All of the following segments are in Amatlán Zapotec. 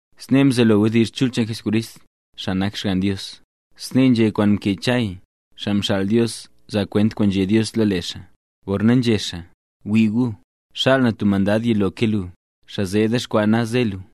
Snee mzelo wdizh chul cheen Jesucrist, xaa nak Xgann Dios. Snee nzhé kwaan mkee Chay, xaa mxaal Dios zaa kwent kwaan nzhé Dios lo lee xaa, gorna nzhé xaa: Wii gu, xaal na tub mandad yilo ke lu, xaa zee dexkwaa naz ze lu.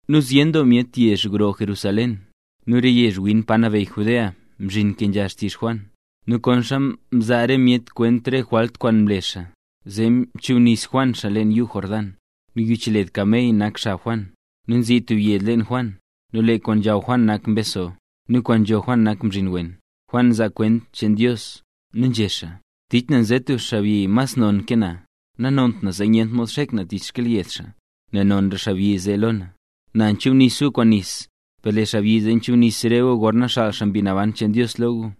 Nu zyen doo myet yezh gro Jerusalén, nu re yezh win pa nabeyy Judea mzhin mkenzha xtizh Juan. Nu konxa mzaa re myet kwent re jwalt kwaan mle xaa, zee mchubnis Juan xaa leen yuu Jordán. Nu yich led kamey nak xab Juan, nu nzii tub yed leen Juan. Nu lee kwaan nzhaw Juan nak mbeso, nu kwaan nzho Juan nak mzhin wen. Juan nzaa kwent cheen Dios, nu nzhé xaa: —Tich na nze stub xaabyi mas non ke na. Nanont na zee nyent mod xek na tich xkyelyed xaa, nel nonra xaabyi zee lo na. Na nchubnis gu kwaan nis, per lee xaabyi zee chubnis re gu gorna xaal xaa Mbi Naban cheen Dios lo gu.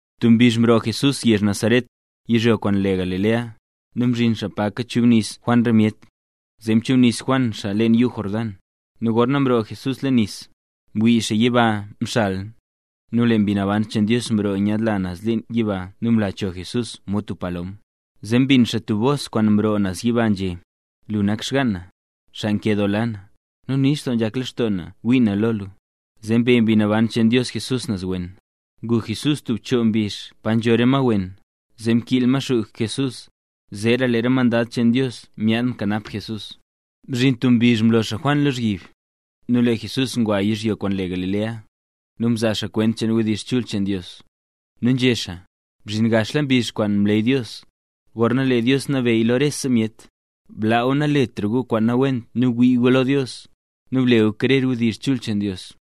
Tub mbizh mroo Jesús yezh Nazaret, yizhyo kwaan le Galilea, nu mzhin xaa pa kachubnis Juan re myet, zee mchubnis Juan xaa leen yuu Jordán. Nu gorna mroo Jesús leen nis, mwii xaa lee yiba mxal, nu lee Mbi Naban cheen Dios mroo nyaadla naz leen yiba nu mla cho Jesús mod tub palom. Zee mbin xaa tub bos kwaan mroo naz yiba, nzhé: —Lu nak xgaan na, xaa nkedoola na, nu nix doo nzhak lextoo na ngwii na lo lu. Zee mbe Mbi Naban cheen Dios Jesús naz wen. Ngu Jesús tub choo mbizh pa nzho re ma wen, zee mkiil Maxuu Jesús. Zeera lee re mandad cheen Dios myaad mkanap Jesús. Mzhin tub mbizh mlo xaa Juan lozhyib, nu lee Jesús ngwa yizhyo kwaan le Galilea, nu mzaa xaa kwent cheen wdizh chul cheen Dios, nu nzhé xaa: —Mzhin gaxla mbizh kwaan mleey Dios, gorna lee Dios nabeyy lo rese myet. Blaa gu naletra gu kwaan nawent nu wii gu lo Dios, nu ble gu krer wdizh chul cheen Dios.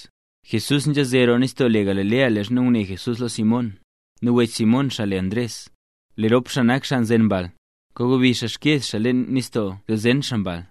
Jesús nzhaze roo nistoo le Galilea leezha ngune Jesús lo Simón, nu wech Simón xaa le Ndres. Lee rop xaa nak xaa nzen mbal. Kagobi xaa xkyeez xaa leen nistoo zee zen xaa mbal.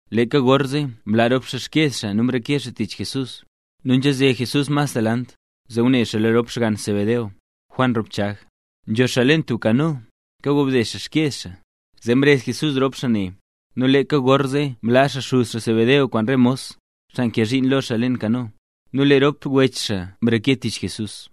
Leeka gorzee mlaa rop xaa xkyeez xaa nu mreke xaa tich Jesús. Nu nzhaze Jesús mas naz delant, zee ngune xaa lo rop xgann Zebedeo, Juan rop Chag. Nzho xaa leen tub kano. Kagobde xaa xkyeez xaa. Zee mrezh Jesús rop xaa ne. Nu leeka gorzee mlaa xaa xuz xaa Zebedeo kwaan re mos, xaa nkee zhiin lo xaa leen kano, nu lee rop wech xaa mreke tich Jesús.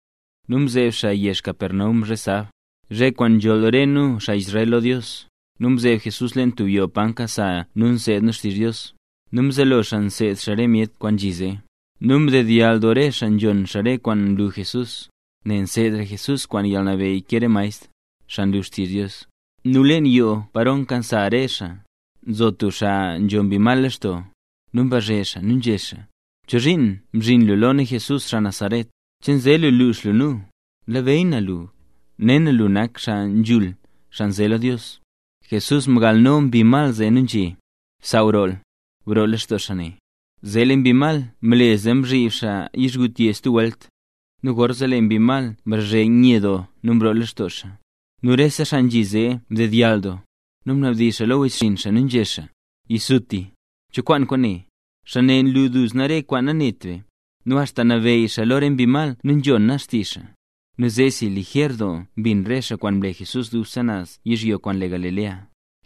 Nu mzeeb xaa yezh Capernaum zhe sab, zhe kwaan nzholl re nu, xaa Israel, lo Dios. Nu mzeeb Jesús leen tub yoo pa nkasa nu nseed nu xtizh Dios, nu mzelo xaa mseed xaa re myet kwaan nzhi zee. Nu mdedyall doo re xaa nzhon xaa re kwaan nlu Jesús, nel nseedra Jesús kwaan yalnabeyy ke re maestr, xaa nlu xtizh Dios. Nu leen yoo paro nkasa re xaa, nzo tub xaa nzho mbi mal lextoo. Nu mbazhe xaa nu nzhé xaa: —¿Chozhiin mzhin lu lo nu Jesús, xaa Nazaret? ¿Che nze lu lux lu nu? Nlabeyy na lu, ne na lee lu nak Xaa Nzhul, xaa nze lo Dios. Jesús mgalno mbi mal nu nzhé: —¡Bsaaw rool! ¡Broo lextoo xaa ne! Zee lee mbi mal mle zee mzhib xaa yizhgutye stub welt, nu gorzee lee mbi mal mrazhe nye doo nu mroo lextoo xaa. Nu rese xaa nzhi zee mdedyall doo. Nu mnabdizh xaa lo wechxinn xaa nu nzhé xaa: —¡Yisutisuti! ¿Cho kwaan kwaane? Xaa ne nlu duzna re kwaan nanet be, nu axta nabeyy xaa lo re mbi mal nu nzhona xtizh xaa. Nu zeesi, lijer doo mbin re xaa kwaan mle Jesús dubse naz yizhyo kwaan le Galilea.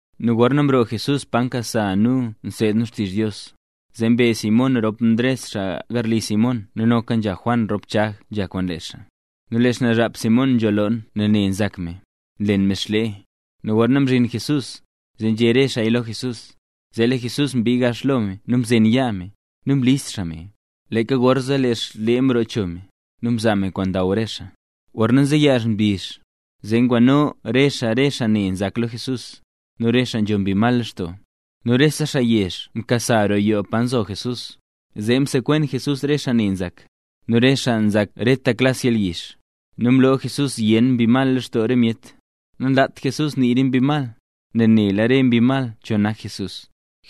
Nu gorna mroo Jesús pa nkasa nu nseed nu xtizh Dios, zee mbe Simón rop Ndres xaa garli Simón nu noka Juan rop Chag nzha kwaan lee xaa. Nu lee xnaazhap Simón nzho loon nel ne nzak me, nlen me xlee. Nu gorna mzhin Jesús, zee nzhé re xaaya lo Jesús. Zee lee Jesús mbii gax lo me nu mzen yaa me, nu mlis xaa me. Leeka gorzee lee xlee mroo cho me, nu mzaa me kwaan ndaw re xaa. Gorna nzeyaaz mbizh, zee ngwano re xaa re xaa ne nzak lo Jesús, nu re xaa nzho mbi mal lextoo. Nu rese xaa yezh mkasa roo yoo pa nzo Jesús, zee msekwen Jesús re xaa ne nzak, nu re xaa nzak reta klas yalyizh. Nu mloo Jesús zyen mbi mal lextoo re myet. Nanlaat Jesús nii re mbi mal, nel nela re mbi mal cho nak Jesús.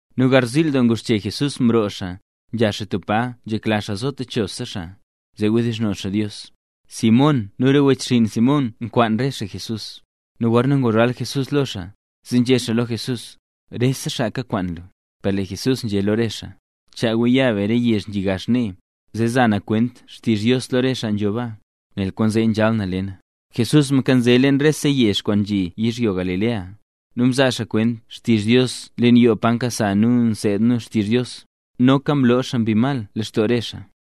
Nu garziil doo nguxche Jesús mroo xaa, nzha xaa tub pa nzhekla xaa zo techosa xaa, zee wdizhno xaa Dios. Simón nu re wechxinn Simón nkwaan re xaa Jesús. Nu gorna nguzhal Jesús lo xaa, zee nzhé xaa lo Jesús: —¡Rese xaa kakwaan lu! Per lee Jesús nzhé lo re xaa: —Chaa gu ya be re yezh nzhi gax nee, zee za na kwent xtizh Dios lo rese xaa nzho baa, nel kwaanzee nzhal na le na. Jesús mkanze leen rese yezh kwaan nzhi yizhyo Galilea, nu mzaa xaa kwent xtizh Dios leen yoo pa nkasa nu nseed nu xtizh Dios. Noka mloo xaa mbi mal lextoo re xaa.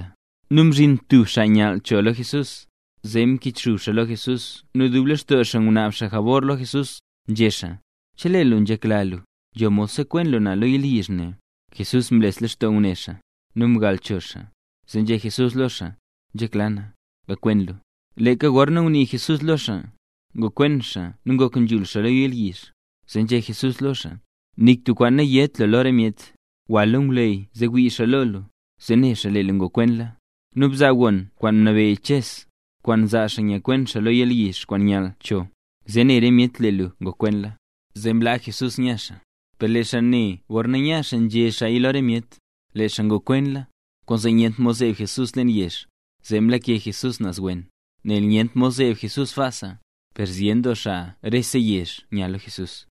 Nu mzhin tub xaa nyall cho lo Jesús, zee mkichxub xaa lo Jesús nu dub lextoo xaa ngunaab jabor lo Jesús, nzhé xaa: —Chelee lu nzhekla lu, nzho mod sekwen lu na lo yalyizh ne. Jesús mles lextoo ngune xaa, nu mgal cho xaa, zee nzhé Jesús lo xaa: —Nzhekla na, gakwen lu. Leeka gorna ngunii Jesús lo xaa, ngokwen xaa nu ngok nzhul xaa lo yalyizh. Zee nzhé Jesús lo xaa: —Nik tub kwaan nayét lu lo re myet. Gwa lo ngwleyy zee wii xaa lo lu, zee né xaa lee lu ngokwenla. Nu bzaa gon kwaan mnabeyy Ches, kwaan nzaa xaa nzhakwen yalyizh kwaan nyall cho, zee ne rese myet lee lu ngokwenla. Zee mlaa xaa Jesús nya xaa, per lee xaa ne gorna nya xaa nzhé xaaya lo re myet, lee xaa ngokwenla. Kwaanzee nyentra mod zeeb Jesús leen yezh, zee mlake Jesús naz wen, nel nyentra mod zeeb Jesús sbaasa. Per zyen doo xaa rese yezh nya lo Jesús.